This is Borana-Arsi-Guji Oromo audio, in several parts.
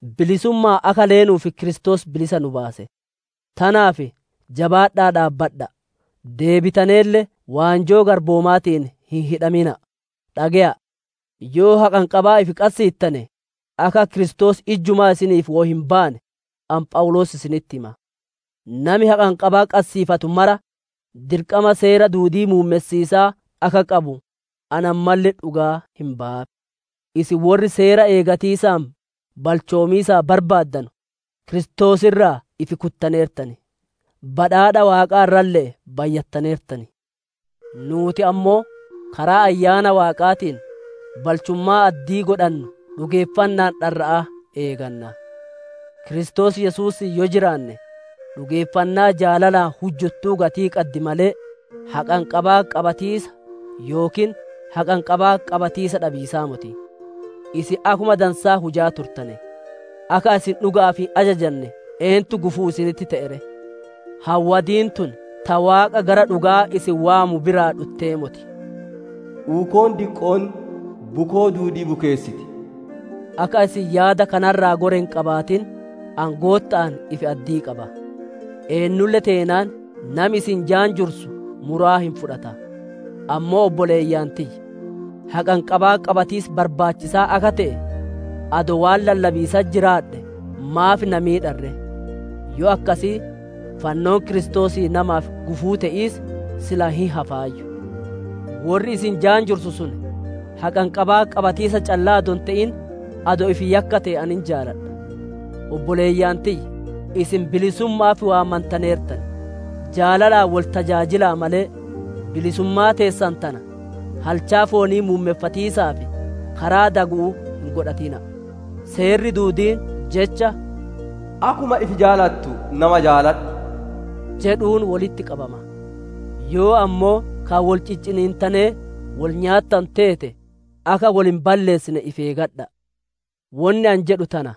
Bilisumma'aan akka leenuuf Kiristoos bilisa nu baase. Tanaaf jabaadha'aa dhaabbadha'a! Deebitaneelle waanjoo garboomaatiin hin hidhamina'a! Dhage'aa! Yoo haqanqabaa ifi qassiittane, akka Kiristoos ijjumaa isiniif woy hin baane, ani Phawuloos isinitti hima. Nami haqanqabaa qassiifatu mara, dirqama Seera duudii muummessiisaa akka qabu ani ammalle dhugaa hin bayaaf. Isin worri Seera eeggatiisaan balchoomiisaaf barbaaddanu, Kiristoos irraa ifi kuttaneertan; badhaadha waaqaa irralle'ee bayyattaneertan. Nuuti ammoo karaa Ayyaana Waaqaatiin, balchummaa addii godhannu dhugeeffanna'aan dharra'aa eeganna. Kiristoos Yesuusiin yoo jiraanne, dhugeeffannaa jaalalaan hujjuttuu gatii qaddi malee, haqanqabaa qabatiisa yookiin haqanqabaa qabatiisa dhabiisaa moti. Isin akkuma dansaa hujaa turtane; akka isin dhuga'aaf hin ajajanne eentu gufuu isinitti te'e ree? Hawadiin tun ta Waaqa gara dhuga'aa isin waamu biraa dhuttee moti. Uukoon diqqoon bukoo duudii bukeessiti. Akka isin yaada kana irraa gore hin qabaatin, ani Gootta'aan ifi-addii qaba. Eennulle teenaan nami isin jaanjursu muraa hin fudhata. Ammoo obboleeyyan tiyya, haqanqabaa qabatiis barbaachisaa akka te'e, adoo waan lallabiisatti jiraadhee, maaf na miidhan ree? Yoo akkasii, fannoon Kiristoosii namaaf gufuu te'iis, silaa hin hafaayyu. Worri isin jaanjursu sun, haqanqabaa qabatiisa callaa adoo hin te'in, adoo ifi yakkate ani hin jaaladha. Obboleeyyan tiyya, isin bilisumma'aaf waammantaneertan; jaalalaan wol tajaajila'a malee, bilisummaa teessan tana halchaa foonii muummeffatiisaaf karaa dagu'uu hin godhatina'a! Seerri duudiin Jecha, «Akkuma ifi jaalattu nama jaaladhu!» jedhuun wolitti qabama. Yoo ammoo ka wol cicciniittanee wol nyaattanu teete, akka wol hin balleessine ifi eeggadha'a! Wonni ani jedhu tana: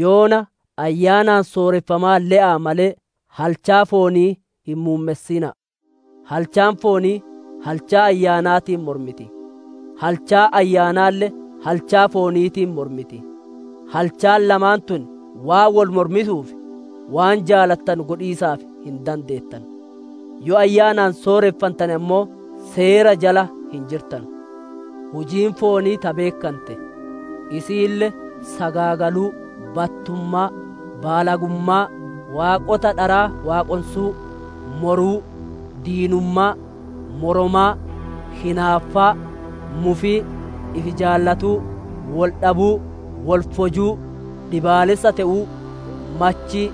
yoona Ayyaanaan sooreffamaa le'aa malee, halchaa foonii hin muummessina'a! Halchaan foonii halchaa Ayyaanaatiin mormiti; halchaan Ayyaanaalle halchaa fooniitiin mormiti; halchaan lamaan tun waan wol mormituuf, waan jaalattanu godhiisaaf hin dandeettanu. Yoo Ayyaanaan sooreffantane ammoo, Seera jala hin jirtanu. Hujiin foonii ta beekkante. Isiille: sagaagaluu, battummaa, baalagummaa, waaqota dharaa waaqonsuu, moruu, diinummaa, moromaa, hinaaffaa, mufii, ifi jaalatuu, wol dhabuu, wol fojuu, dhiibbaleessa te'uu, machii,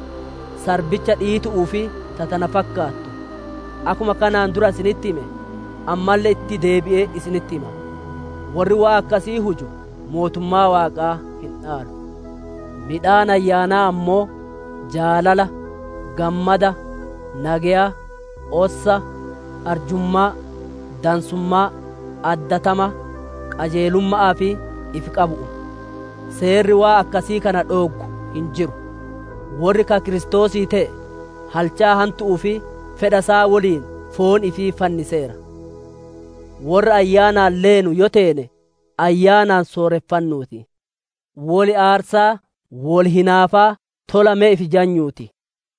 sarbicha dhiitu'uu fi ta tana fakkaattu. Akkuma kanaan dura isinitti hime, ammalle itti deebi'ee isinitti hima: worri waan akkasii huju mootummaa Waaqaa hin dhaalu. Midhaan Ayyaanaa ammoo jaalala, gammada, nageya, ossa, arjummaa, dansummaa, addatama, qajeelumma'aa fi ifi qabatiisa. Seerri waan akkasii kana dhooggu hin jiru. Worri ka Kiristoosii te'e, halchaa hantu'uu fi fedha isaa woliin foon ifii fanniseera. Worra Ayyaanaan leenu yoo teene, Ayyaanaan sooreffannuu ti. Wol aarsaa, wol hinaafaa, tola me ifi jajnuu ti!